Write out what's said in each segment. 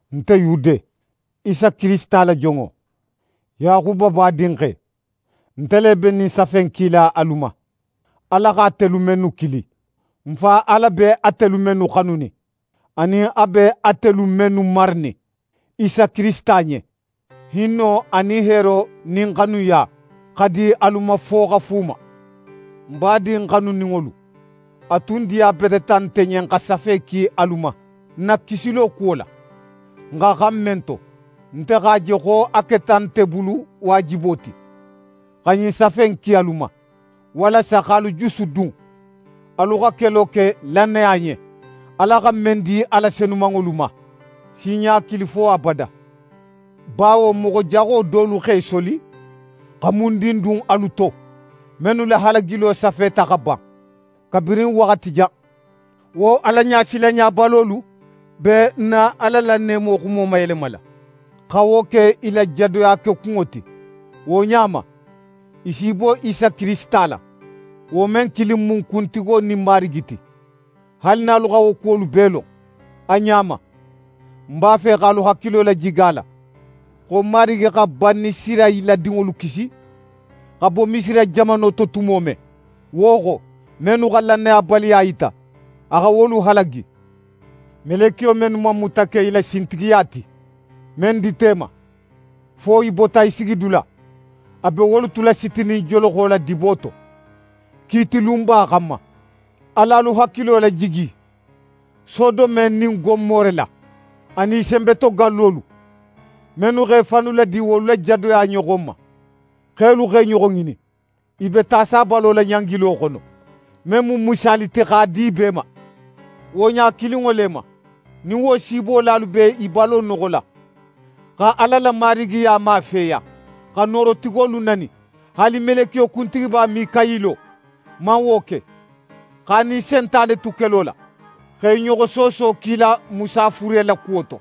Nte Yude, Isa Kirisita la jonŋo, Yaxuba badinxe, nte le be ɲin safe in kila alu ma, Ala xa atelu mennu kili, n Fa Ala be atelu mennu xanunin, anin a be atelu mennu maranin Isa Kirisita ɲen: Hinno anin heero nin xanuya xa di alu ma fo xa fuuma. N badin xanuninŋolu, a tun diyabeteta nte ɲen xa safe ki alu ma n na kisilo kuwo la, n xa xan men to. Nte x'a je xo a keta nte bulu waajibo ti xa ɲin safe in ki alu ma, walasa x'alu jusudun alu xa kelo ke lannaya ɲen, Ala xa men di a la senumanŋolu ma sinɲa kilin fo abada. Bawo moxo jaxo dolu x'e soli xa mundin dun alu to, mennu la halagilo safeta xa ban kabirin waxati jan. Wo Alaɲasilanɲabalolu be n na Ala la neemo xuno mayelemala, xa wo ke i la jadoya kekunŋo ti. Wo ɲa ma, i s'i bo Isa Kirisita la, wo men kilin mu n Kuntigo nin n Marigi ti. Haali nin alu xa wo kuwolu bee lon a ɲa ma, ń b'a fe x'alu hakilo lajigi a la xo Marigi xa Banisirayila dinŋolu kisi xa bo Misira jamano to tumo men, wo xo, mennu xa lannayabaliya yita, a xa wolu halagi. Melekiyo mennu man muta ke i la sintigiya ti, men dita i ma, fo i bota i sigidula, a be wolu tula sitinin joloxo la dibo to, kiiti lunba xanma. Al'alu hakilo lajigi Sodome nin Gomore la, anin i senbetogallolu, mennu x'e fannu ladi wolu la jadoya ɲoxon ma, xelu x'e ɲoxo ŋinin. I be ta sabalo la ɲangilo xono, men mu misaali ti x'a di bee ma. Wo ɲa kilinŋo le ma, nin wo siibolalu be i balo noxola, xa Ala la Marigiya mafeya, xa Noorotigolu nani. Haali meleke kuntigiba Minkayilo man wo ke. X'a nin Sentane tu kelo la, x'e ɲoxo sooso kila Musa fure la kuwo to,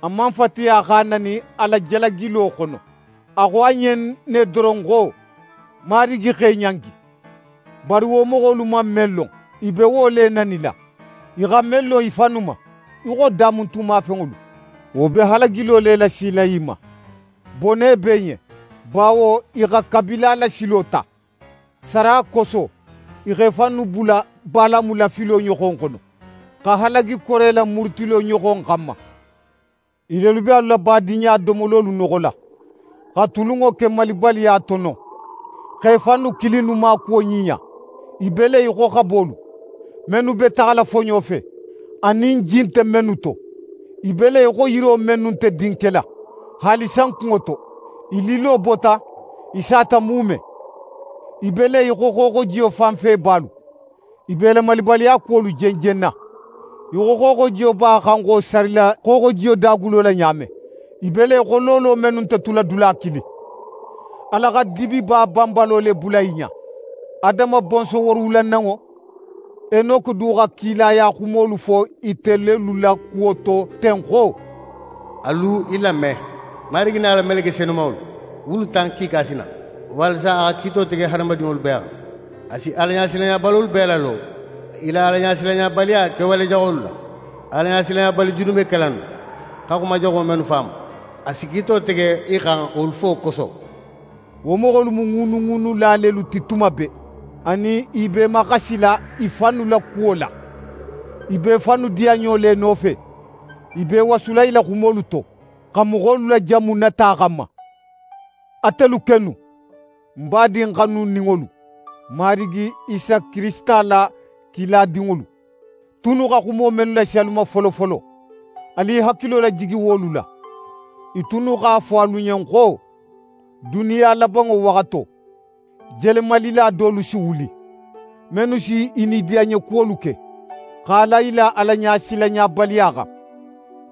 a man fatiya x'a nani a la jalagilo xono. A xo a ɲen ne doron xo: «Marigi x'é ɲangi!» Bari wo moxolu man men lon, i be wo le nanila. I xa men lon i fannu ma, í xo damuntunmafenŋolu, wo be halagilo le lasila i ma. Bone be i ɲen, bawo i xa Kabila la silo ta. Sara koso, i x'e fannu bula Balamu la filo ɲoxon xono, xa halagi Kore la murutilo ɲoxon xanma. I lelu be alu la badinɲadomololu noxola, xa tulunŋo ke malibaliya to non, x'e fannu kilinnu maakuwo ɲiɲa. I be le í xo xabolu mennu be taxala foɲo fe, anin ji nte mennu to. I be le í xo yiro mennu nte din kela haali sankunŋo to, i lillo bota, i sata muume. I be le í xo xooxojiyo fanfebalu, i be i la malibaliya kuwolu jenjenna í xo xooxojiyo b'a xanxo sarila xooxojiyo dagulo la ɲa men. I be le í xo loolo mennu nte tula dula kilin. Ala xa dibiba banbalo le bula i ɲa. Adama bonson woorowulananŋo Enoke du xa kilaya xumolu fo ite lelu la kuwo to ten xo: «Alu i lame: Marigi nin a la meleke senumanŋolu wulu tan kiika si na, walasa xa kiito tege hadamadinŋolu bee xan. A si Alaɲasilanɲabalolu bee lalo i la Alaɲasilanɲabaliya kewale jaxolu la. Alaɲasilanɲabali junubekela innu xa xuma jaxo mennu fo a ma, a si kiito tege i xan wolu fo koso.» Wo moxolu mu ŋuunuŋuunula lelu ti tuma bee, anin i b'e maxasila i fannu la kuwo la. I be i fannu diyanɲo le nofe, i be i wasula i la xumolu to, xa moxolu lajanmu nata xanma. Atelu kennu, ń badin xanuninŋolu, n Marigi Isa Kirisita la kiladinŋolu tunnu xa xumo mennu lasi alu ma folofolo, alu i hakilo lajigi wolu la. I tunnu x'a fo alu ɲen xo: «Duniya labanŋo waxato, jelenmalila dolu si wuli, mennu si i nidiyanɲekuwolu ke, x'a la i la Alaɲasilanɲabaliya xan.»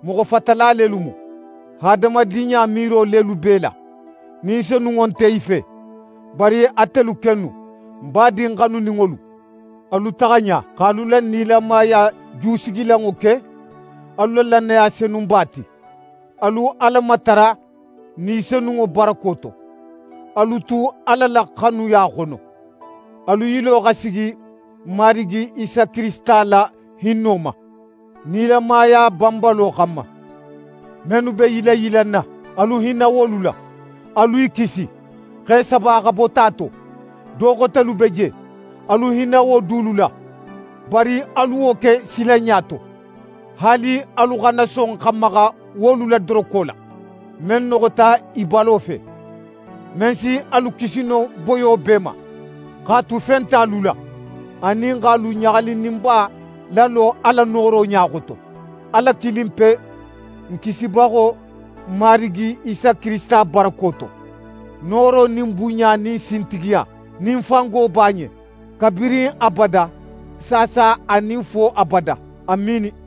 Moxo fatala lelu mu. Hadamadinɲa miiro lelu b'e la, Ni Senunŋo nte i fe. Bari atelu kennu, ń badin xanuninŋolu, alu taxa ɲa x'alu la nilamaya jusigilanŋo ke alu la lannaya senumanba ti. Alu Ala matara Ni Senunŋo barako to. Alu tu Ala la xanuya xono; alu yilo xa sigi n Marigi Isa Kirisita la hinno ma, nilamaya banbalo xanma. Mennu be yilanyilanna, alu hinna wolu la. Alu i kisi, x'e saba xa bo ta to. Do xotelu be je, alu hinna wo dulu la, bari alu wo ke silanɲa to. Haali alu xana son xa maxa wolu la doroko la, men noxota i balo fe. Men si alu kisi no boyo bee ma, x'a tu fe nte alu la, anin x'alu ɲaxalininba lalo a la nooro ɲa xoto, Ala kilinpe, n Kisibaxo, n Marigi Isa Kirisita barako to: Nooro nin bunɲa nin sintigiya nin fango b'a ɲen kabirin abada, saasa anin fo abada! Amiini.